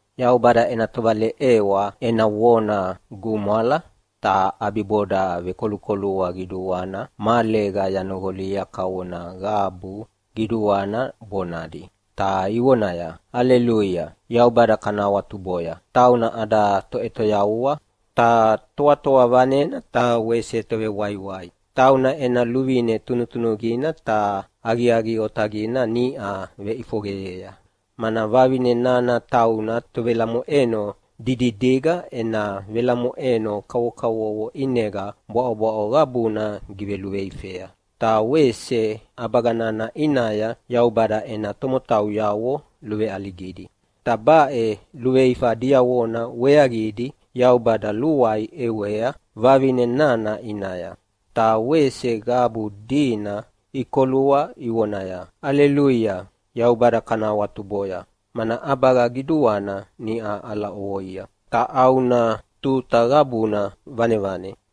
Yaubada ena tovaleʼewa ena vona gumwala, ta ʼabiboda vekolukolua qiduana mahalega yanoqolia kavona qabu qiduana bonadi, ta ivonaya, “Aleluia! Yaubada kana awatuboya, tauna ada Toʼetoyavua ta Toatoa Vanena ta wese Tovewaiwai. Tauna ena luvine tunutunuqina ta aqiaqi otaqina niʼa veʼifoqeyea, mana vavine nana tauna tovelamoʼeno dididiga ena velamoʼeno kavokavovo ʼinega bwaʼobwaʼo qabuna giveluveifea, ta wese ʼabaga nana ʼinaya Yaubada ena tomotauyavo luveʼaligidi. Ta baʼe luveifa diavona weaqidi Yaubada luai ʼewea vavine nana ʼinaya.” Ta wese qabu dina ikolua ivonaya, “Aleluia! Yaubada kana awatuboya, mana ʼabaga qiduana niʼa ʼala ʼovoia ta ʼauna tuta qabuna vanevane.”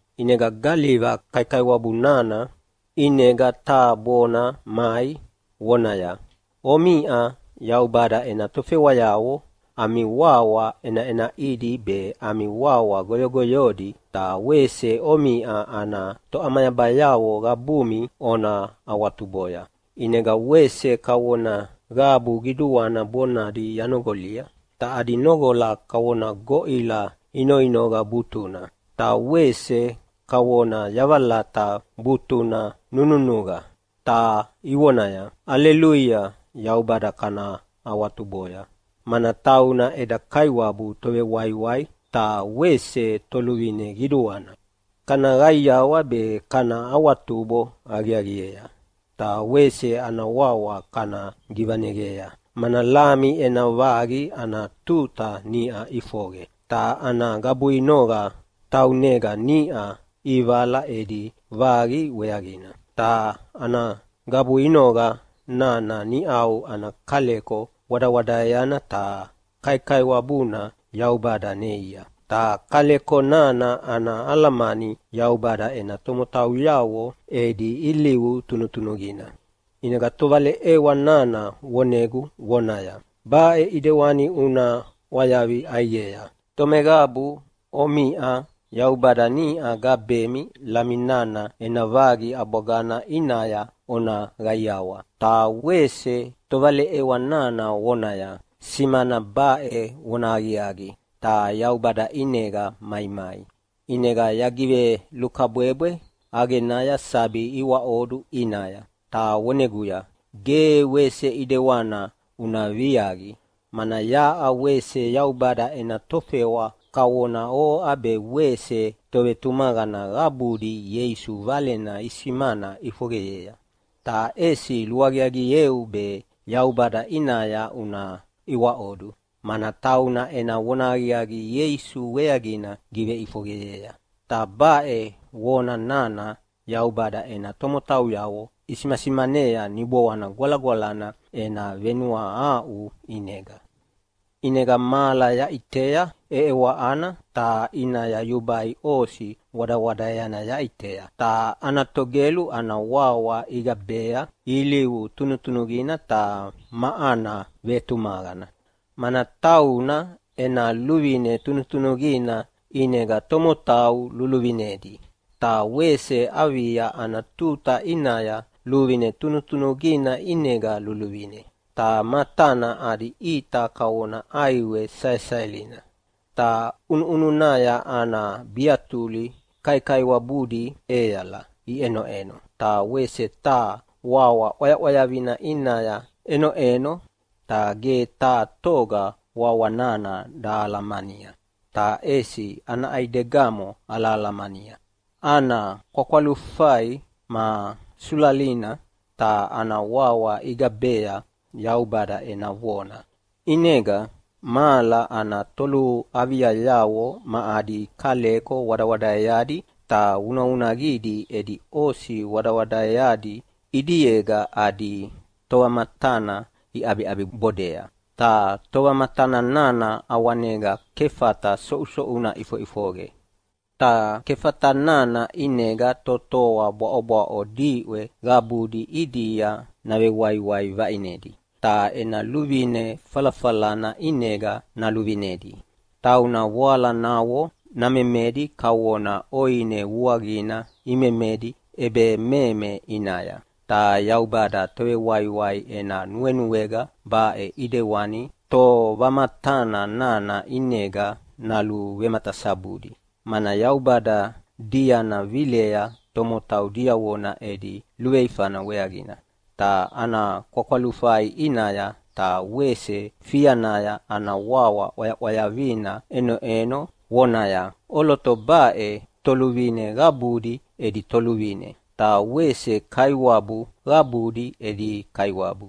ʼInega galiva kaikaiwabu nana ʼinega taha bona mai, vonaya, “Omiʼa Yaubada ena tofewayavo ami wawa ʼenaʼenaʼidi be ami wawa goyogoyodi ta wese omiʼa ana toʼamayabayavo qabumi ona awatuboya.” ʼInega wese kavona qabu qiduana bonadi yanoqolia, ta adi noqola kavona goʼila inoinoqa butuna, ta wese kavona yavalata butuna nununuqa, ta ivonaya, “Aleluia! Yaubada kana awatuboya, mana tauna eda Kaiwabu Tovewaiwai ta wese Toluvine Qiduana. Kana qaiawa be kana awatubo aqiaqiea ta wese ana wawa kana givaneqea, mana Lami ena vaqi ana tuta niʼa ʼifoqe, ta ana gabuinoqa taunega niʼa ʼivala edi vaqi weaqina, ta ana gabuinoqa nana niʼau ana kaleko wadawadaeana ta kaikaiwabuna Yaubada neia.” (Ta kaleko nana ana alamani Yaubada ena tomotauyavo edi ilivu tunutunuqina.) ʼInega tovaleʼewa nana vonegu vonaya, “Baʼe ʼidewani una ʼwayavi ʼaiqea: Tomeqabu omiʼa Yaubada niʼa gabemi Lami nana ena vaqi ʼabwagana ʼinaya ona qaiawa.” Ta wese tovaleʼewa nana vonaya, “Simana baʼe vonahaqiaqi, ta Yaubada ʼinega maimai.” ʼInega yagivelukabwebwe ʼaqenaya sabi iwaʼodu ʼinaya, ta voneguya, “Ge wese ʼedewana una viaqi, mana yaʼa wese Yaubada ena tofewa kavona oʼa be wese tovetumaqana qabudi Ieisu Valena isimana ʼifoqeyea. Ta ʼesi luaqiaqieu be Yaubada ʼinaya una iwaʼodu, mana tauna ena vonahaqiaqi Ieisu weaqina giveʼifoqeyea, ta baʼe vona nana Yaubada ena tomotauyavo isimasimanea Niboana Gwalagwalana ena venuahaʼu ʼinega.” ʼInega mahala yaʼitea ʼeʼewaʼana, ta ʼinaya yubai osi wadawadaeana yaʼitea, ta ana togelu ana wawa igabea, “Ilivu tunutunuqina ta ma ana vetumaqana.” Mana tauna ena luvine tunutunuqina ʼinega tomotau luluvinedi, ta wese avia ana tuta ʼinaya luvine tunutunuqina ʼinega luluvine. Ta matana adi ʼita kavona ʼaiwe saesaelina, ta ʼunuʼununaya ana biatuli kaikaiwabudi ʼeala iʼenoʼeno. Ta wese taha wawa ʼwayaʼwayavina ʼinaya ʼenoʼeno, ta ge taha toga wawa nana dahalamania, ta ʼesi ana ʼaidegamo alahalamania. Ana kwakwalufai ma sulalina, ta ana wawa igabea “Yaubada ena Vona”. ʼInega mahala ana toluaviayavo ma adi kaleko wadawadaeadi ta vunavunaqidi edi osi wadawadaeadi ʼidiega adi Tovamatana iʼabibodea. Ta Tovamatana nana ʼawanega kefata soʼusoʼuna ʼifoʼifoqe, ta kefata nana ʼinega totoa bwaʼobwaʼo diʼwe qabudi ʼidia navewaiwai vaʼinedi, ta ena luvine falafalana ʼinega naluvinedi. Tauna voalanavo namemedi kavona ʼoine vuaqina imemedi ʼebememe ʼinaya. Ta Yaubada Tovewaiwai ena nuenuega baʼe ʼidewani Tovamatana nana ʼinega naluvematasabudi, mana Yaubada diana vilea tomotau diavona edi luveifana weaqina. Ta ana kwakwalufai ʼinaya ta wese fianaya ana wawa ʼwayaʼwayavina ʼenoʼeno vonaya, “ʼOloto baʼe toluvine qabudi edi Toluvine, ta wese kaiwabu qabudi edi Kaiwabu.”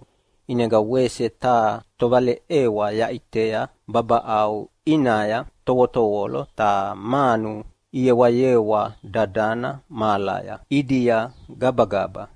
ʼInega wese taha tovaleʼewa yaʼitea babaʼau ʼinaya tovotovolo ta manu iyewayewa dadana mahalaya ʼidia gabagaba,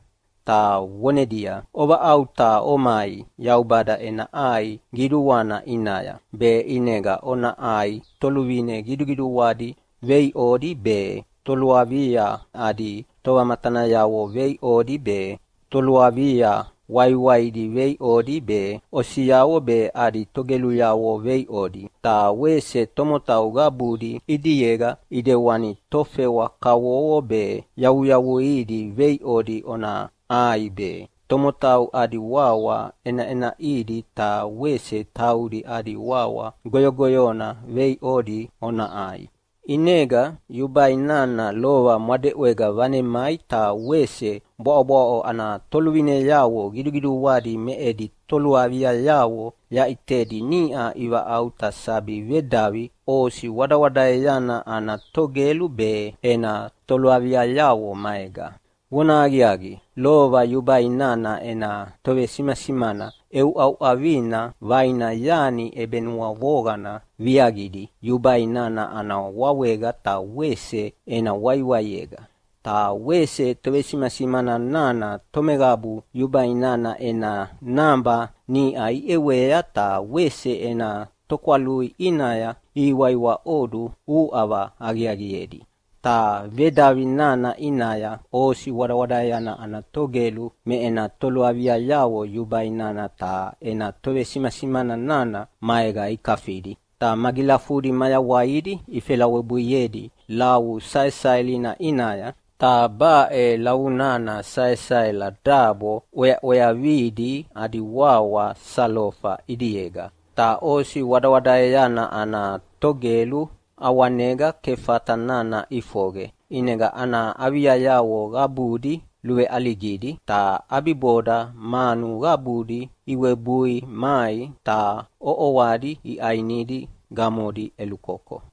ta vonedia, “Ovaʼauta omai Yaubada ena ʼai qiduana ʼinaya, be ʼinega ona ʼai toluvine qiduqiduadi veiʼodi be, toluavia adi tovamatanayavo veiʼodi be, toluavia waiwaidi veiʼodi be, osiavo be adi togeluyavo veiʼodi, ta wese tomotau qabudi ʼidiega ʼidewani tofewa kavovo be yavuyavuidi veiʼodi ona ʼai be, tomotau adi wawa ʼenaʼenaʼidi ta wese taudi adi wawa goyogoyona veiʼodi ona ʼai.” ʼInega yubai nana lova mwadeʼwega vanemai ta wese bwaʼobwaʼo ana toluvineavo qiduqiduadi me edi toluaviayavo yaʼitedi niʼa ivaʼauta sabi vedavi osi wadawadaeana ana Togelu be ena toluaviayavo maega. Vonahaqiaqi, lova yubai nana ena tovesimasimana ʼeʼeuʼauʼavina vaina yani ʼebenuavoqana viaqidi yubai nana ana wawega ta wese ena waiwaiega. Ta wese tovesimasimana nana tomeqabu yubai nana ena naba niʼa iʼewea ta wese ena tokwalui ʼinaya ihiwaiwaʼodu uʼava aqiaqiedi. Ta vedavi nana ʼinaya osi wadawadaeana ana Togelu me ena toluaviayavo yubai nana ta ena tovesimasimana nana maega ikafidi. Ta magilafudi mayawaidi ifelawebuiedi lavu saesaelina ʼinaya, ta baʼe lavu nana saesaela dabo ʼweaʼweavidi adi wawa salofa ʼidiega. Ta osi wadawadaeana ana Togelu ʼawanega kefata nana ʼifoqe, ʼinega ana aviayavo qabudi luveʼaligidi. Ta ʼabiboda manu qabudi iwebui mai ta ʼoʼoadi iʼanidi gamodi ʼelukoko.